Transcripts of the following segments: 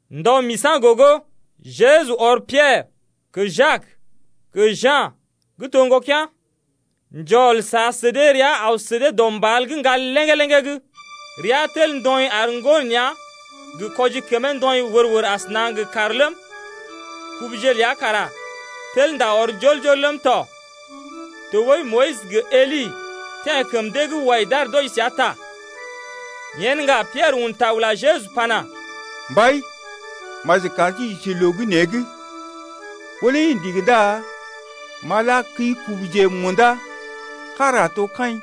Ndɔ misa̰ gogo, Jeju ɔr Piɛrə, gə Jak gə Ja̰ gə́ to ŋgokea̰ njɔl sa sə dee rəa aw sə dee dɔ mbal gə́ ŋgal léŋgé-léŋgé’g. Rea tel ndɔḭ ar ŋgo nea̰ gə kwɔji kəmee ndɔḭ wər-wər asəna gə kàr ləm, kubuje ləa kara tel ndá ɔr njɔl-njɔl ləm tɔ. Tɔɓəi Moyis gə Eli teḛ kəm dee’g wai d’aar d’wɔji səa ta. Yen ŋga Piɛrə un ta ula Jeju pana: Mbai, maji kar sí j’isi loo gə́ nee’g, ɓó lé i ndigi ndá m’a la kəi-kubuje munda, kára a to kaḭ,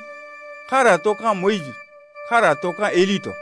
kára a to ka̰ Moyis, kára a to ka̰ Eli tɔ.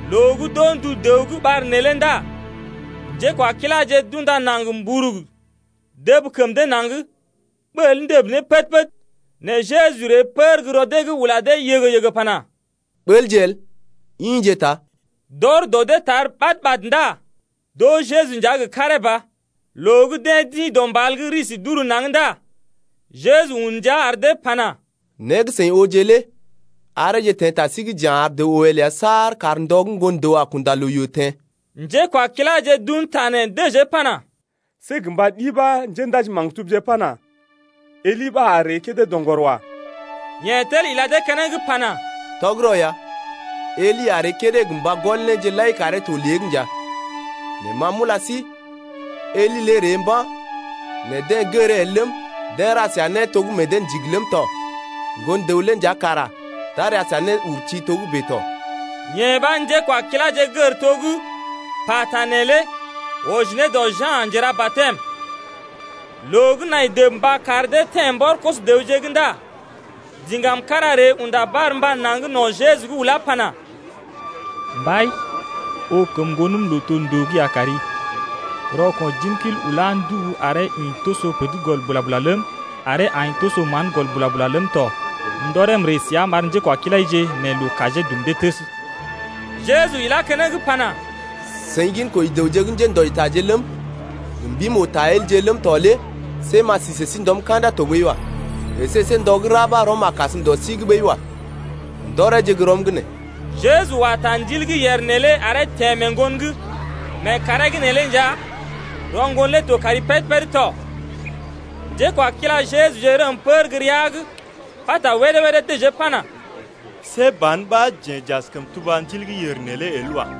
Loo gə́ d’oo ndu dəw gə́ ɓar neelé ndá njékwakiláje d’unda naŋg mburug dəb kəm dee naŋg ɓəl ndəb ne pəd-pəd. Nɛ Jeju ree pər gə́ rɔ dee’g ula dee yəgə-yəgə pana: Ɓəlje el, ḭje ta. D’ɔr dɔ dee tar ɓad-ɓad ndá d’oo Jeju nja gə karee ba. Loo gə́ deḛ d’ḭ dɔ mbal’g risi d’uru naŋg ndá Jeju un ndia ar dee pana: Né gə́ seḭ ooje lé areeje teḛ ta sí’g ja̰ ar dəw oo el saar kar ndɔ gə́ Ŋgon-dəw a kunda loo yoo teḛ. Njékwakiláje d’un ta nee dəjee pana: See gə mba ɗi ɓa njéndaji-maktubje pana, Eli ɓa a ree kédé doŋgɔr wa. Yeḛ tel ila dee keneŋ pana: Tɔgərɔ ya, Eli a ree kédé gə mba gɔl néje lai karee to lée’g nja. Nɛ ma nja m’ula sí, Eli lé ree mba̰, nɛ deḛ gəree el ləm, deḛ ra səa né to gə́ meḛ dee ndigi ləm tɔ. Ŋgon-dəw lé nja kara d’a ra səa néurti togə́bè tɔ. Yee ɓa njékwakiláje gər to gə́ pata neelé wɔji ne dɔ Ja̰ Njera-batɛm. Loo gə́ nai dəb mba kar dee teḛ mbɔr koso-dəwje’g ndá diŋgam kára ree unda barmba naŋg no̰ Jeju’g ulá pana: Mbai, oo kəm ŋgonəm lootondoo’g ya kari, rɔko̰ jimkil ulá ndubu aree ḭ toso pər’d gɔl bula-bula ləm, aree aḭ toso mán gɔl bula-bula ləm tɔ. M’ndɔree m’ree səa m’ar njékwakilaije nɛ loo kajee dum dee təs. Jeju ilá keneŋ pana, seḭ ginkoji dəwje gə́ njéndɔjitaje ləm, gə mbim-oo-ta-elje ləm tɔ lé see m’a si sə sí ndɔm ka̰da tɔɓəi wa. Esé see ndɔ gə́ ra ɓa rɔm a kasm dɔ sí’g ɓəi wa. Ndɔreeje gə́ rɔm’g nee. Jeju wa ta ndil gə́ yèr neelé aree teḛ mee ŋgon’g lé. Mee kàree’g neelé nja rɔ ŋgon lé to kari péd-péd tɔ. Njékwakila Jejuje rəm pər gə́ rəa’g pata wédé-wédé dəjee pana: See ban ɓa jeḛ j’askəm tuba ndil gə́ yèr neelé el wa.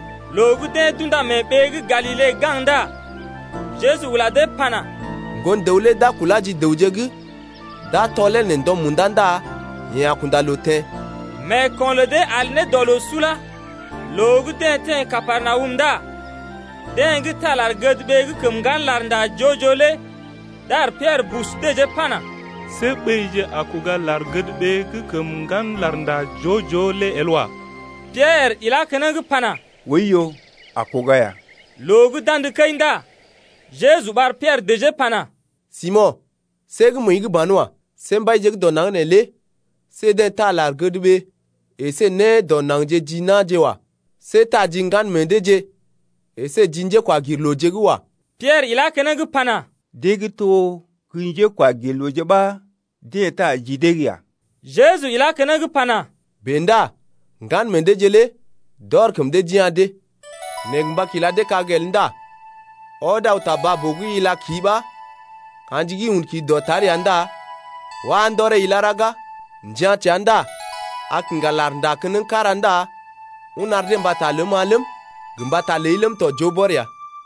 Loo gə́ deḛ d’unda mee ɓee gə́ Galile gaŋg ndá Jeju ula dee pana: Ŋgon-dəw lé d’a kulá ji dəwje’g, d’a tɔlee nɛ ndɔ munda ndá yeḛ a kunda loo teḛ. Meeko̰ lə dee al ne dɔ loo sula ya. Loo gə́ deḛ teḛ Kapernawum ndá deḛ gə́ taa lar-gədɓee gə́ kəm ŋgan larnda joo-joo lé dar Piɛrə bus dəjee pana: See ɓéije a kuga lar-gədɓee gə́ kəm ŋgan larnda joo-joo lé el wa. Piɛrə ilá keneŋ pana: Oiyo, a kuga ya. Loo gə́ d’andə kəi ndá Jeju ɓar Piɛrə dəjee pana: Simo̰, see gə́ məəi’g banwa. See mbaije gə́ dɔ naŋg neelé see deḛ taa lar-gədɓee əsé né dɔ naŋgje ji na̰je wa. See taa ji ŋgan meḛ deeje əsé ji njékwagirlooje’g wa. Piɛrə ilá keneŋ pana: Deḛ gə́ to gə́ njékwagirlooje ɓa deḛ taa ji dee’g ya. Jeju ilá keneŋ pana: Bèe ndá ŋgan meḛ deeje lé d’ɔr kəm dee d’ya̰ dee. Nɛ gə mba kila dee kag el ndá ɔd aw ta baa-boo’g ila ki ɓa ka̰ji gə́ un ki dɔtar ya ndá wá ndɔree ilá ɗaga, njia̰ təa ndá a kiŋga lar gə́ nda keneŋ kára ndá un ar dee mbata ləm-ma ləm, gə mbata ləi ləm tɔ joo bɔr ya.